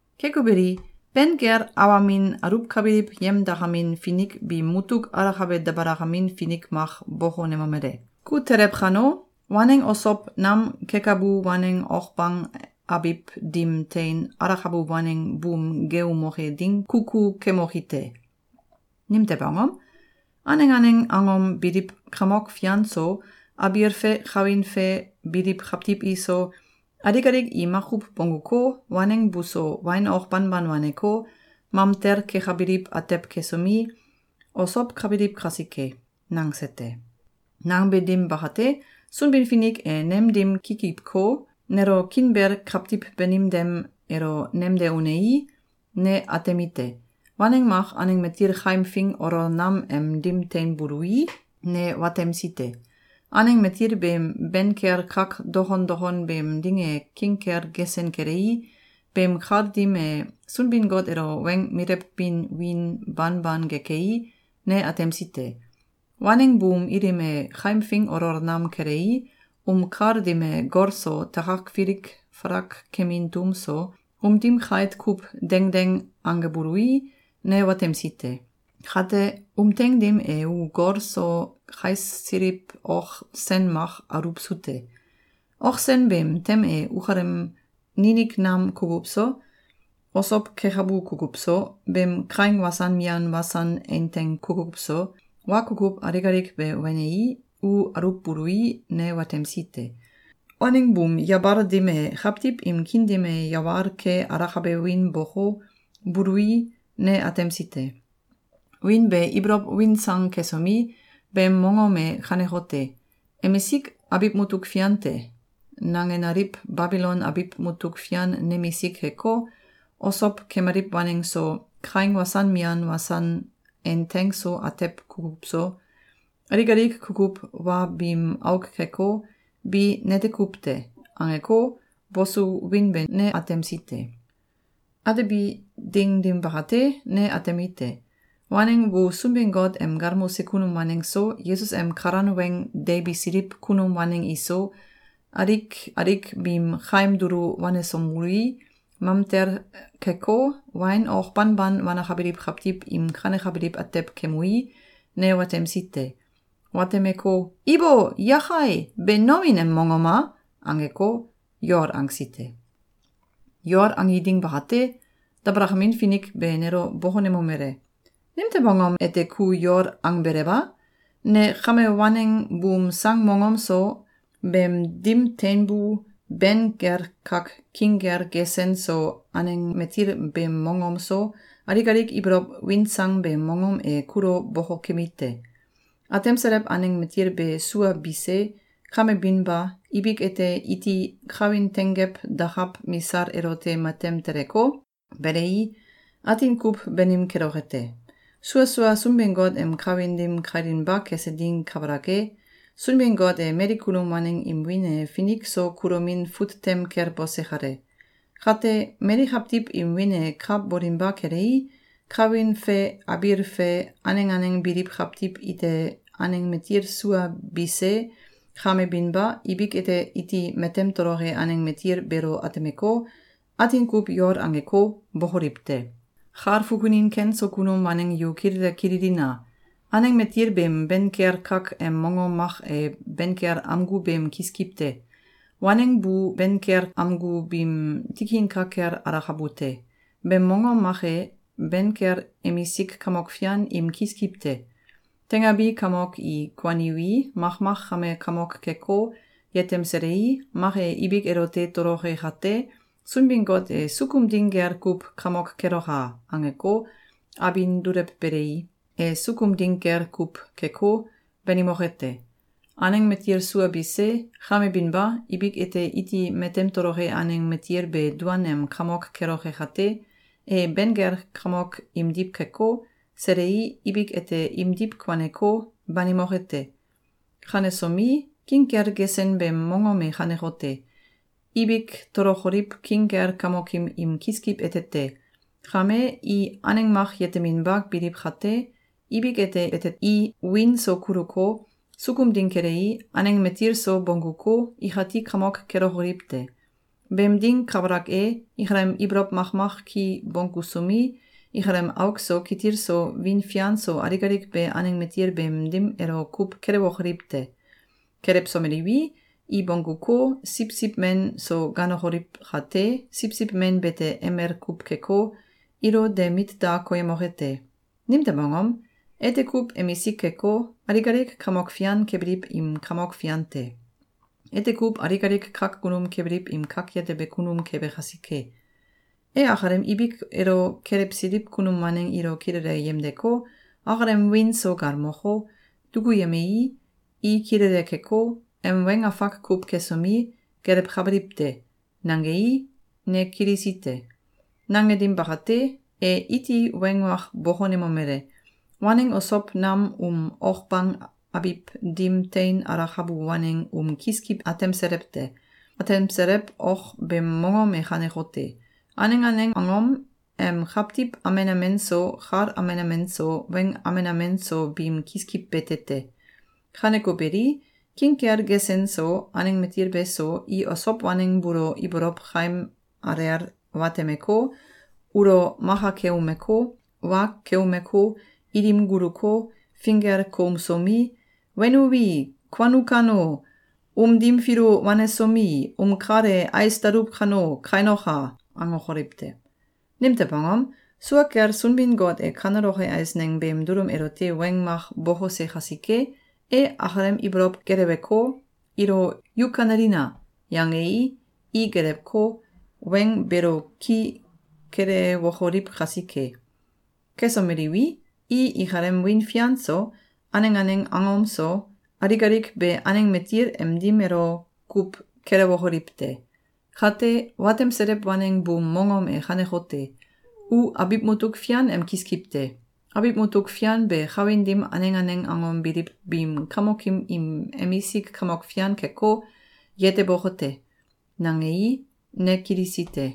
Keko beli, ben kel awamin aluwkabiliw yemdakamin finik biim mutuk alakabe dabalakamin finik mak bokonemomele: “Ku telew kano, waneng osow nam kekabu waneng ok bang abiw dim tein alakabu waneng buum geeumoke ding kukukemoki te. Nimtew angom? Aneng aneng angom biliw kamok fian so, abiil fe kawin fe biliw kawtiw iso, alik alik i makuw bongguko, waneng buso wain ok banban waneko, mamtel kekabiliw atew kesomi, osowkabiliw kasike.”, nangse te. Nangbe dim bakate, Sunbin-Finik e nem dim kikiwko, nelo kiinbel kawtiw banim dim elo nemde unei, ne atemite: Waneng mak aneng matil kaimfing olol nam em dim teinbului, ne watemsi te. Aneng matil beem ben kel kak dokon dokon beem dim e king kel gesen kelei, beem kal dim e Sunbin-Got elo weng milewbin wiin banban gekei, ne atemsi te. Waneng buum ilim e kaimfing olol nam kelei, um kal dim e gol so, takak filik falak kemin tum so, um dim kait kuw dengdeng angebului, ne watemsi te. Kate, um teing dim e u gol so kaisliw ok sen mak aluwsu te. Ok sen beem tem e ukalem ninik nam kukuw so, osow kekabu kukuw so, beem kaing wasan mian wasan einteng kukuw so, wa kukuw alik alik be wenei, u aluwbului, ne watemsi te. Waneng buum yabal dim e kawtiw im kiin dim e yawal ke alakabe wiin boko, bului, ne atemsi te. Wiin be ibolow win sang kesomi, beem mongom e kanekote: “‘Emisik abiw mutuk fian te!’, nangenaliw Babilon abiw mutuk fian nemisik keko, osow kemaliw waneng so, kaing wasan mian wasan einteng so atew kukuw so, alik alik kukuw wa biim auk keko, bi nete kuw te!”, angeko, bosu wiin be ne atemsi te. Atebi ding dim bakate, ne atemite: Waneng bu Sunbin-Got em galmose kunum waneng so, Yesus em kalan weng deibisiliw kunum waneng iso, alik alik biim kaim dulu wanesomelui, mamtel keko, wain ok banban wanakabiliw kawtiw im kanekabiliw atew kemui, ne watemsi te. Watemeko, “Ibo! Yakai! Be nomin em mongom a?”, angeko, yol angsi te. Yol angi ding bakate, dabalakamin finik be nelo bokonemomele: “Nimtew angom ete ku yol angbelew a? Ne kame waneng buum sang mongom so, beem dim tenbu ben kel kak king kel gesen so aneng matil beem mongom so, alik alik ibolow win sang beem mongom e kulo bokokemi te. Atemselew aneng matil be sua bise, kame binba, ibik ete iti kawin tenggew dakaw misal elote matem teleko, belei, atin kuw banim keloke te. Sua sua Sunbin-Got em kawin dim kailinba kese ding kabalak e, Sunbin-Got e mali kunum waneng im wiin e finik so kulomin fut tem kel bose kale. Kate, mali kawtiw im wiin e ka bolinba kelei, kawin fe abiil fe aneng aneng biliw kawtiw ite aneng matil sua bise, kame binba, ibik ete iti matem toloke aneng matil beelo atemeko, atin kuw yol angeko, bokoliw te. Kal fukunin ken so kunum waneng yu kilele kililina! Aneng matil beem ben kel kak em mongom mak e ben kel amgu beem kiskiw te. Waneng bu ben kel amgu biim tikin ka kel alakabu te. Beem mongom mak e, ben kel emisik kamok fian im kiskiw te. Teingabi kamok i kuaniwi, makmak kame kamok keko, yetemselei, mak e ibik elote toloke kate, Sunbin-Got e ‘Sukum ding gel kuw kamok keloka!’, angeko, abin dulewbelei, e sukum ding gel kuw keko, banimoke te. Aneng matil sua bise, kame binba, ibik ete iti matem toloke aneng matil be duan em kamok keloke kate, e ben kel kamok imdiw keko, selei, ibik ete imdiw kuaneko, banimoke te. Kanesomi, king kel gesen beem mongom e kanekote: Ibik tolokoliw king kel kamokim im kiskiw ete te. Kame, i aneng mak yeteminba biliw kate, ibik ete i wiin so kuluko, sukum ding kelei, aneng matil so bongguko, ikati kamok kelokoliw te. Beem ding kabalak e, ikalem ibolow makmak ki bonggusomi, ikalem auk so kitil so wiin fian so alik alik be aneng matil beem dim elo kuw kelewokoliw te. Kelewsomeliwi, i bongguko, Siwsiw Men so ganokoliw kate, Siwsiw Men bete emel kuw keko, ilo de mit da koyemoke te. Nimtew angom? Ete kuw emisik keko, alik alik kamok fian kebiliw im Kamok Fian te. Ete kuw alik alik kak kunum kebiliw im Kak Yetebe Kunum kebe kasike. E akalem ibik elo kelewsiliw kunum waneng ilo kilele yemdeko, akalem wiin so galmoko, dukuyemei, i kilele keko, em weng afak kuw kesomi, gelewkabiliw te.”, nangei, ne kilisi te. Nange dim bakate, e iti weng mak bokonemomele: “Waneng osow nam um ok bang abiw dim tein alakabu waneng um kiskiw atemselew te. Atemselew ok beem mongom e kanekote: Aneng aneng angom em kawtiw amen amen so, kal amen amen so, weng amen amen so biim kiskiw bete te. Kaneko beli, king kel gesen so, aneng matil beso, i osow waneng buulo ibolow kaim alel watemeko, ulo maka keumeko, wa keumeko, ilim guluko, finggel koumsomi, ‘Wenuwi, kuanu kano, um dim filu wanesomi, um kal e ais daluw kano, kainoka!’, angokoliw te. Nimtew angom? Sua kel Sunbin-Got e kaneloke eisneng beem dulum elote weng mak bokose kasike, e akalem ibolow geleweko, ilo ‘Yu kanelina!’, yangei, i gelewko, weng beelo ki kelewokoliw kasike. Kesomeliwi, i ikalem wiin fian so, aneng aneng angom so, alik alik be aneng matil em dim elo kuw kelewokoliw te. Kate, watemselew waneng buum mongom e kanekote: U abiw mutuk fian em kiskiw te. Abiw mutuk fian be kawin dim aneng aneng angom biliw biim kamokim im emisik kamok fian keko, yeteboke te.”, nangei, ne kilisi te.